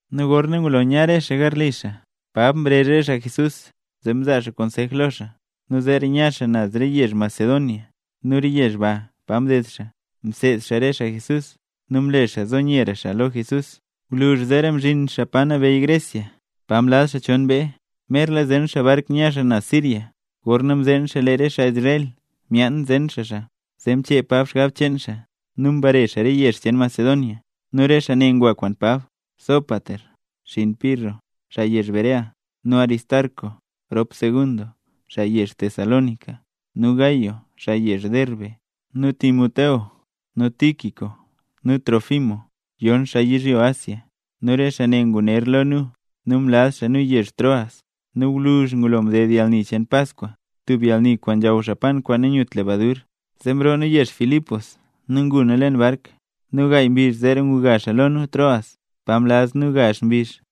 Nu gorna ngulola nya re xaa garli xaa, Pab mrezh re xaa Jesús zee mzaa konsej lo xaa, nu zeera nya xaa naz re yezh Macedonia. Nu re yezh pa mded xaa, mseed xaa re xaa Jesús nu mle xaa nyera nzo xaa lo Jesús; gwluzh zeera mzhin xaa pa nabeyy Grecia, pa mlaz xaa chon mbee. Merla zen xaa bark nya xaa naz Siria, gorna mzeen xaa lee re xaa Israel myaan zen xaa xaa. Zee mchee Pab xgab cheen xaa nu mbare xaa re yezh cheen Macedonia. Nu re xaa ne ngwa kwaan Pab: Sópater xgann Pirro xaa yezh Berea, nu Aristarco rop Segundo xaa yezh Tesalónica, nu Gayo xaa yezh Derbe, nu Timoteo nu Tíquico nu Trófimo yon xaa yizhyo Asia. Nu re xaa ne nguner lo nu, nu mlaz xaa nu yezh Troas. Nu gwluzh ngulo mded yalni cheen Paskwa, tub yalni kwaan nzhaw xaa Israel pan kwaan nanyut lebadur, zee mroo nu yezh Filipos, nu ngu nu leen bark. Nu gaay mbizh zeera nguga xaa lo nu Troas, pa mlaz nu gazh mbizh.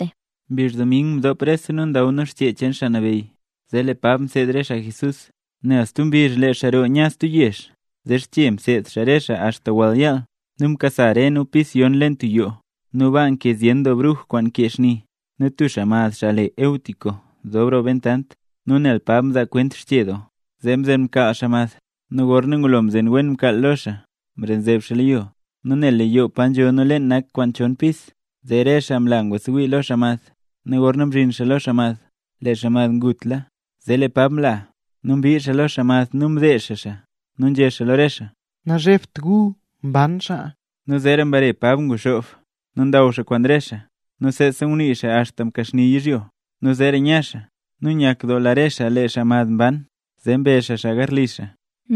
Mbizh dming mdop rese nu ndaw nu Xchee cheen Xaa Nabeyy, zee lee Pab mseed re xaa Jesús. Nel stub mbizh lee xaa roo nya stub yezh, zee xche mseed xaa re xaa axta wall yaal. Nu mkasa re nu pis yon leen tub yoo, nu baa nkee zyen doo bruj kwaan nkee xni. Nu tub xaa mad le Eutico nzob roo bentant, nu nel Pab mzaa kwent xche doo, zee mzen mkaal xaa mad, nu gorna ngulo mzen wen mkaal garlo xaa mad, mrenzeb xaa mad lo yo. Nu nel lee yoo pa nzho nu leen nak kwaan chon pis, zee rese xaa mla ngwasewii lo xaa mad, nu gorna mzhin xaa lo xaa mad, lee xaa mad ngutla. Zee lee Pab mla, nu mbii lo xaa mad nu mdezh xaa xaa. Nu nzhé xaa lo re xaa: —Nazhebt gu, mban xaa. Nu zeera mbare Pab nguxoob, nu ndaw xaa kwaan re xaa, nu seesa ngunii xaa axta mkaxni yizhyo. Nu zeera nya xaa. Nu nyakdoola re xaa lee xaa mad mban nu mbe xaa xaa garli xaa.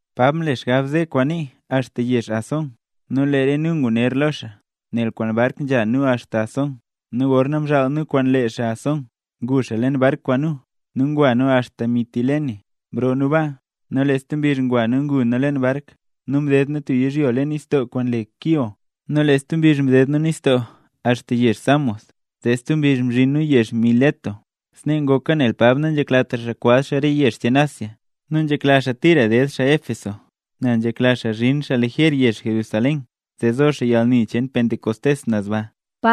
Pab mle xgab ze xaa kwaan nii xaa axta yezh Asón, nu lee nu nguner lo xaa, nel kwaan bark nzha nu axta Asón. Nu gorna mzhaal nu kwaan lee xaa Asón, ngu xaa leen bark kwaan nu, nu ngwa nu axta Mitilene. Mroo nu baa, nu lee stub mbizh ngwa nu ngu nu leen bark nu mded nu tub yizhyo leen nistoo kwaan le Quío. Nu lee stub mbizh mded nu nistoo axta yezh Samos. Zee stub mbizh mzhin nu yezh Mileto. Snee ngoka nel Pab nanzheklatra xaa kwaz xaa re yezh cheen Asia, nu nzhekla xaa tira ded xaa Éfeso; nel nzhekla xaa zhin xaa lejer yezh Jerusalén, zee zo xaa yalni cheen Pentecostés naz baa.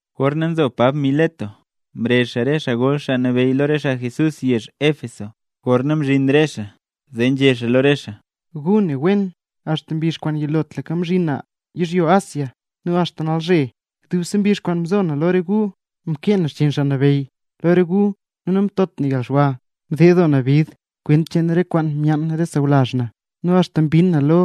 Gorna nzo Pab Mileto, mrezh xaa re xaa gol xaa nabeyy re xaa Jesús yezh Éfeso. Gorna mzhin re xaa zee nzhé xaa lo re xaa: —Gu ne wen, axta mbizh kwaan yilotlaka mzhin na yizhyo Asia nu axta nalzhe, dubse mbizh kwaan mzo na lo re gu, mkee na xchiin Xaa Nabeyy lo re gu nu namtot na yalxwa. Mded doo na bid kwent cheen re kwaan myaan re xaa sawlazh na nu axta mbinn na lo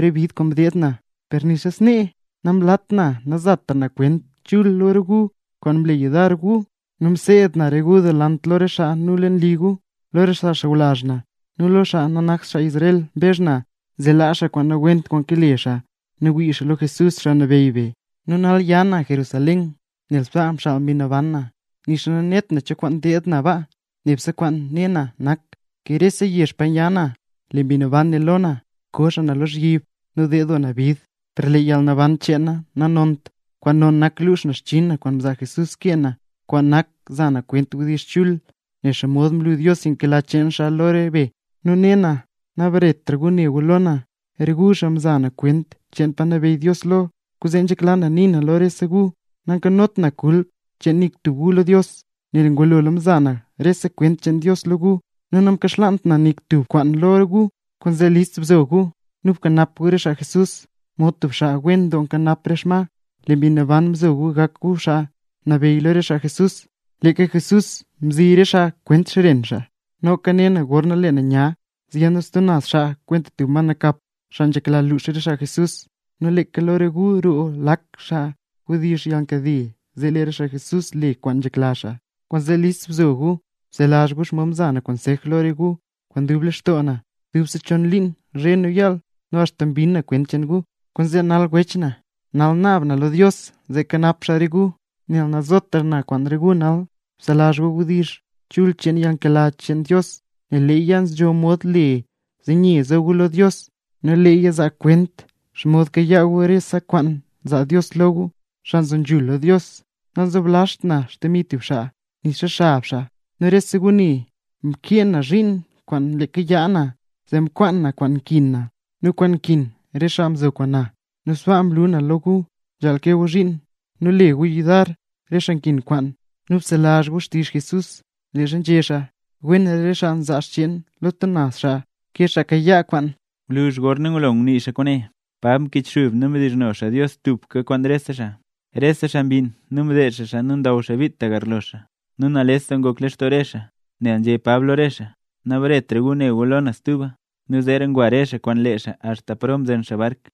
re bid kwaan mdeed na. Per nixa snee, namlat na namzatra na kwent chul lo re gu, kwaan mle yudar gu; nu mseed na re gu delant lo re xaa nu leen li re gu. Lo xaa sawlazh na nu lo xaa nanakt xaa Israel mbezh na, zee laa xaa kwaan nawent kwaan kale xaa nu wii xaa lo Jesús, Xaa Nabeyy be. Nu nal nya na Jerusalén nel sbaa mxaal Mbi Naban na, nixa nanet na cho kwaan deed na baa. Nebse kwaan ne na nak, ke rese yezh pa nya na, lee Mbi Naban né lo na, ko xaa na lozhyib nu ded doo na bid. Per lee yalnaban cheen na nanont, kwaan non nak lux na xchiin na kwaan mzaa Jesús kee na, kwaan nak za na kwent wdizh chul, nen xomod mlu Dios yalnkela cheen xaa lo re be. ’Nu ne na, nabaretra gu ne gu lo na, re gu xaa mza na kwent cheen pa nabeyy Dios lo. Kwaanzee nzhekla na nii na lo rese gu, nankanot na kulp cheen nik tub gu lo Dios. Nel ngulola mza na rese kwent cheen Dios lo gu, nu namkaxlaant na nik tub kwaan lo gu. Kwaanzee list bzo gu, nu bkanap gu re xaa Jesús, mod tub xaa wen doo nkanap re xma, nel lee Mbi Naban mzo gu gak gu xaa nabeyy lo re xaa Jesús, leeka Jesús mzi re xaa kwaan xren xaa. Noka ne na gorna lee na nya, zyiid stub naz xaa kwenta tub ma nakap, xaa nzhekla luux re xaa Jesús. Nu leeka lo gu roo lak xaa wdizh yalnkade zee lee re xaa Jesús le kwaan nzhekla xaa. Kwaanzee list bzo gu nu bselazh gu xomod mza na konsej lo re gu kwaan dub lextoo na, dubse chon liin zhe nu yaal, nu axta mbinn na kwent cheen gu. ’Kwaanzee nal wech na, nal naab na lo Dios zee kanap xaa re gu, nel nazotra na kwaan re gu nal. Bselazh gu wdizh chul cheen yalnkela cheen Dios nel leeya nzho mod le zee nye nzo gu lo Dios, nu leeya zaa kwent xomod kayaa gu rese kwaan nzaa Dios lo gu, xaa nzo nzhul lo Dios. Namzoblazht na xdemi tub xaa, nixa xab xaa. Nu rese gu ne, mkee na zhiin kwaan leeka yaa na, zee mkwaan na kwaan nkin na nu kwaan nkin re xaa mzo kwaan na. Nu sbaa mlu na lo gu, nzhaal kee gu zhiin nu le gu yudar re xaa nkin kwaan. Nu bselazh gu xtizh Jesús leezha nzhé xaa: “Wenra re xaa nzaa xcheen lo stub naz xaa, ke xaa kayaa kwaan”. Gwluzh gorna ngulo ngunii xaa kwaane, Pab mkichxub nu mdizhno xaa Dios tubka kwaan rese xaa. Rese xaa mbinn, nu mdezh xaa xaa nu ndaw xaa bit ta garlo xaa. Nu nales doo ngok lextoo re xaa, nel nzhé Pab lo xaa: “Nabaretra gu ne gu lo na stuba”. Nu zeera ngwa re xaa kwaan lee xaa axta paro mzen xaa bark.